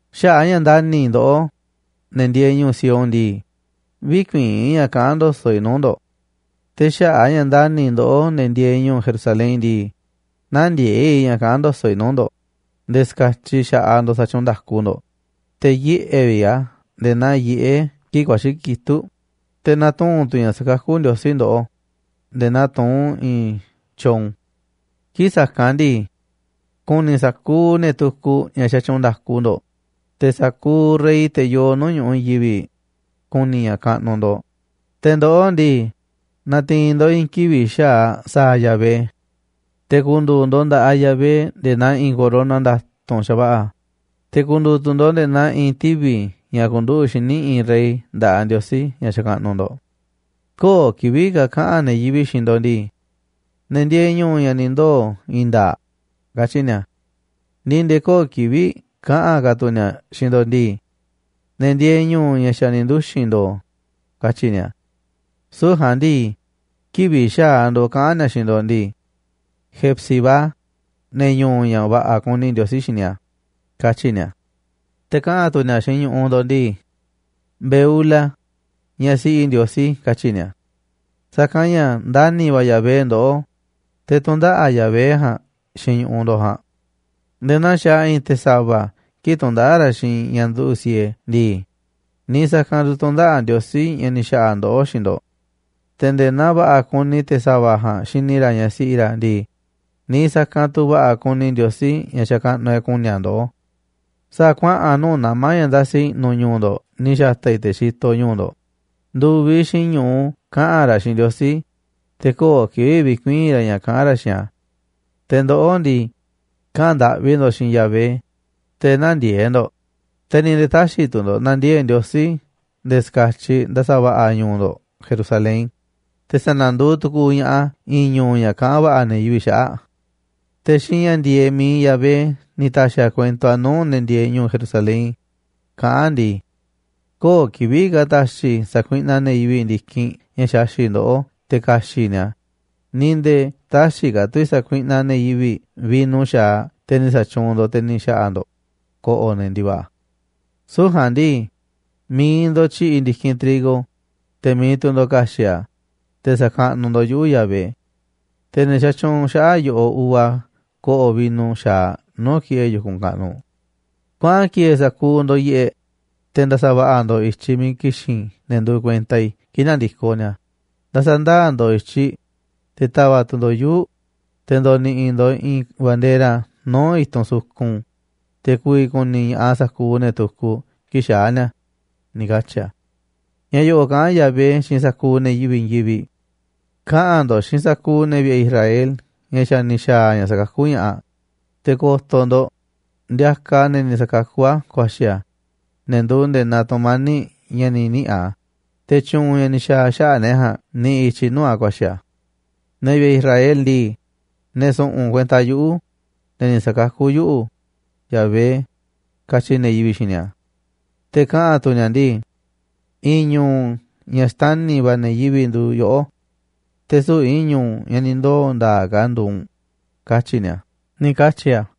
Xaꞌa̱ꞌ a̱ ña̱ ndani̱ i̱ ndoꞌó, ne̱ ndieeꞌ ñu̱u̱ Sión ndii, vï̱kuii̱n i̱ ña̱ kaꞌán ndo̱so̱ꞌ i̱ nuu̱ꞌ ndo̱ꞌ. Te̱ xaꞌa̱ꞌ a̱ ña̱ ndani̱ i̱ ndoꞌó, ne̱ ndieeꞌ ñu̱u̱ Jerusalén ndii, nä̱ndiee̱ꞌ i̱ ña̱ kaꞌán ndo̱so̱ꞌ i̱ nuu̱ꞌ ndo̱ꞌ nde̱e̱ ska̱tyiꞌ xa̱ꞌaꞌ ndo̱ꞌ sa̱tyuunꞌ nda̱ku ndo̱ꞌ, te̱ yiꞌe̱ vi̱ꞌ a̱ nde̱e̱ naa yiꞌé kii̱ꞌ ku̱a̱xi̱ kitúꞌ, te̱ na̱tuu̱n tu̱ ña̱ sa̱kakú Ndiosí ndoꞌó, nde̱e̱ naa tuún i̱i̱n tyoon. Kii̱ꞌ sa̱kanꞌ ndii, ku̱ni̱ sa̱kuuꞌ ne̱ tukuꞌ ña̱ xatyuunꞌ nda̱ku ndo̱ꞌ. Te̱ sa̱kuuꞌ rey, te̱ yoo nuu̱ꞌ ñu̱ꞌuꞌ i̱i̱n yivi̱ꞌ, ku̱ni̱ ña̱ kaꞌnuꞌ ndo̱ꞌ. Te̱ ndoꞌó ndii, na̱ti̱i̱n ndo̱ꞌ i̱i̱n kivi̱ꞌ xa̱aꞌ sa̱a̱ Yahvé. Te̱ ku̱ndu̱u̱ ndo̱ꞌ nda̱ꞌaꞌ Yahvé nde̱e̱ naa i̱i̱n corona nda̱tu̱nꞌ xa̱va̱ꞌa̱, te̱ ku̱ndu̱u̱ tu̱ ndo̱ꞌ nde̱e̱ naa i̱i̱n tivi̱ ña̱ nduꞌu̱ꞌ xíniꞌ i̱i̱n rey nda̱ꞌaꞌ Ndiosí ña̱ xakaꞌnuꞌ ndo̱ꞌ. Köo̱ꞌ kivi̱ꞌ ka̱ kaꞌa̱n ne̱ yivi̱ꞌ xiinꞌ ndo̱ꞌ ndii: “Ne̱ ndieeꞌ ñu̱u̱ ña̱ ni̱ ndoo̱ i̱i̱n nda̱a̱ꞌ”, katyi̱ ni̱a̱. Ni̱ nde̱e̱ köo̱ꞌ kivi̱ꞌ kaꞌa̱n ka̱ tu̱ ni̱a̱ xiinꞌ ndo̱ꞌ ndii: “Ne̱ ndieeꞌ ñu̱u̱ ña̱ xa̱ ni̱ nduxi̱n ndo̱o̱”, katyi̱ ni̱a̱. Süu̱ꞌ ja̱a̱nꞌ ndii, kivi̱ꞌ xa̱aꞌ ndo̱ꞌ kaꞌa̱n ni̱a̱ xiinꞌ ndo̱ꞌ ndii: “Hefzi-bá, ne̱ ñu̱u̱ ña̱ va̱ꞌa̱ kuni Ndiosí xini a̱”, katyi̱ ni̱a̱. Te̱ kaꞌa̱n tu̱ ni̱a̱ xiinꞌ ñu̱ꞌuꞌ ndo̱ꞌ ndii: “Beula, ñaꞌ siꞌi Ndiosí”, katyi̱ ni̱a̱. Sa̱kanꞌ ña̱ ndani̱ va̱ Yahvé ndoꞌó, te̱ tu̱ndaꞌa̱ꞌ Yahvé ja̱a̱nꞌ xiinꞌ ñu̱ꞌuꞌ ndo̱ꞌ ja̱a̱nꞌ. Nde̱e̱ naa xaaꞌ i̱i̱n te̱ sa̱va̱ kii̱ꞌ tundaꞌáꞌ ra̱ xiinꞌ i̱i̱n ñaꞌ nduꞌu̱ꞌ siee ndii, ni̱i̱ sa̱kanꞌ tu̱ tu̱ndaꞌa̱ꞌ Ndiosí ña̱ ni̱ xa̱ꞌa̱ ndoꞌó xiinꞌ ndo̱ꞌ. Te̱ nde̱e̱ naa va̱ꞌa̱ kuni te̱ sa̱va̱ ja̱a̱nꞌ xini ra̱ ñaꞌ siꞌi ra̱ ndii, niiꞌ sa̱kanꞌ tu̱ va̱ꞌa̱ kuni Ndiosí, ña̱ xakaꞌnuꞌ e̱ꞌ, ku̱ni̱ a̱ ndoꞌó. Sa̱a̱ kuaꞌa̱n nuu̱ꞌ nama̱ ña̱ ndasi i̱ꞌnu̱ ñu̱u̱ ndo̱ꞌ ni̱ xa̱ta̱ i̱ te̱ xitoꞌ ñu̱u̱ ndo̱ꞌ ndu̱viꞌ xiinꞌ ñu̱u kaꞌa̱n ra̱ xiinꞌ Ndiosí, te̱ köo̱ꞌ kivi̱ꞌ vi̱kuii̱n ra̱ ña̱ kaꞌán ra̱ xiinꞌ a̱. Te̱ ndoꞌó ndii, kaꞌa̱n ndaꞌvi ndo̱ xiinꞌ Yahvé, te̱ nä̱ndiee̱ꞌ ndo̱ꞌ, te̱ ni̱ nde̱e̱ tä̱xi̱ tu̱ ndo̱ꞌ na̱ndiee̱ꞌ Ndiosí nde̱e̱ ska̱tyiꞌ nda̱sa̱ va̱ꞌa̱ ñu̱u̱ ndo̱ꞌ Jerusalén, te̱ sa̱na̱nduuꞌ tu̱ku̱u̱ ña̱ꞌaꞌ a̱ i̱i̱n ñu̱u̱ ña̱ kaꞌán va̱ꞌa̱ ne̱ yivi̱ꞌ xaꞌa̱ꞌ a̱. Te̱ xiinꞌ ña̱ ndi̱e̱eꞌ mi̱iꞌ Yahvé ni̱ ta̱xi̱ a̱ kuento a̱ nuu̱ꞌ ne̱ ndieeꞌ ñu̱u̱ Jerusalén, kaꞌán a̱ ndii: “Köo̱ꞌ kivi̱ꞌ ka̱ ta̱xi̱ i̱ sa̱kuiꞌnaꞌ ne̱ yivi̱ꞌ ndi̱kinꞌ ña̱ xaxi̱ꞌ ndoꞌó te̱ ka̱xi̱ꞌ ni̱a̱ a̱, ni̱ nde̱e̱ tä̱xi̱ ka̱ tu̱ i̱ sa̱kuiꞌnaꞌ ne̱ yivi̱ꞌ vino xa̱aꞌ teꞌ ni̱ xatyuunꞌ ndo̱ꞌ te̱ ni̱ xa̱ꞌa̱ ndo̱ꞌ ko̱ꞌo̱ ne̱ ndi̱va̱ꞌa̱. Süu̱ꞌ ja̱a̱nꞌ ndii, mi̱iꞌ ndo̱ꞌ tyi̱ꞌi̱ ndi̱kinꞌ trigo, te̱ mi̱iꞌ tu̱ ndo̱ꞌ ka̱xi̱ꞌ a̱, te̱ sa̱kaꞌnuꞌ ndo̱ꞌ yuꞌu̱, Yahvé. Te̱ ne̱ xatyuunꞌ xaꞌa̱ꞌ yoꞌó uva ko̱ꞌo̱ vino xa̱aꞌ nuu̱ꞌ ki̱ꞌe̱ yu̱kunꞌ kaꞌnuꞌ. Kuaꞌa̱n ki̱e̱e̱ sa̱kuuꞌ ndo̱ꞌ yiꞌeꞌ, te̱ nda̱sa̱ va̱ꞌa̱ ndo̱ꞌ i̱tyiꞌ miiꞌ ki̱xi̱n ne̱ nduuꞌ kuenta i̱ kii̱ꞌ na̱ndi̱koꞌ ni̱a̱. Nda̱sa̱ ndaa̱ ndo̱ꞌ i̱tyiꞌ, te̱ ta̱va̱ꞌ tu̱ ndo̱ꞌ yuu̱ꞌ, te̱ ndo̱ni̱ꞌi̱ ndo̱ꞌ i̱i̱n bandera nuu̱ꞌ i̱tunꞌ sukun, te̱ ku̱vi̱ ku̱ni̱ ña̱ꞌaꞌ sa̱kuuꞌ ne̱ tukuꞌ kii̱ꞌ xaa̱ ni̱a̱”, ni̱ katyi̱ a̱. Ña̱ yo̱ꞌo̱ꞌ kaꞌán Yahvé xiinꞌ sa̱kuuꞌ ne̱ yivi̱ꞌ i̱i̱n yivi̱ꞌ: “Kaꞌa̱n ndo̱ꞌ xiinꞌ sa̱kuuꞌ ne̱ vi̱ꞌe̱ Israel ña̱ xa̱ ni̱ xa̱a̱ ña̱ sa̱kakú ña̱ꞌaꞌ. Te̱ ko̱to̱ ndo̱ꞌ, ndiakaꞌ a̱ ne̱ ni̱ sa̱kakú a̱ ku̱a̱xi̱ a̱, ne̱ nduuꞌ nde̱e̱ naa tu̱mani̱ꞌ ña̱ ni̱ niꞌi̱ a̱, te̱ tyu̱u̱n ña̱ ni̱ xa̱a̱ xaꞌa̱ꞌ ne̱ ja̱a̱nꞌ niꞌiꞌ i̱tyiꞌ nuu̱ꞌ a̱ ku̱a̱xi̱ a̱. Ne̱ vi̱ꞌe̱ Israel ndii, ne̱ su̱ꞌu̱n kuenta yuꞌu̱, ne̱ ni̱ sa̱kakú yuꞌu̱, Yahvé, katyi̱ ne̱ yivi̱ꞌ xiinꞌ ni̱a̱. Te̱ kaꞌa̱n tu ni̱a̱ ndii: I̱i̱n ñu̱u̱ ña̱ xtani̱ va̱ ne̱ yivi̱ꞌ nduuꞌ yoꞌó. Te̱ süu̱ꞌ i̱i̱n ñu̱u̱ ña̱ ni̱ ndoo̱ i̱i̱n nda̱a̱ꞌ ka̱ nduuꞌ u̱nꞌ, katyi̱ ni̱a̱”, ni̱ katyi̱ a̱.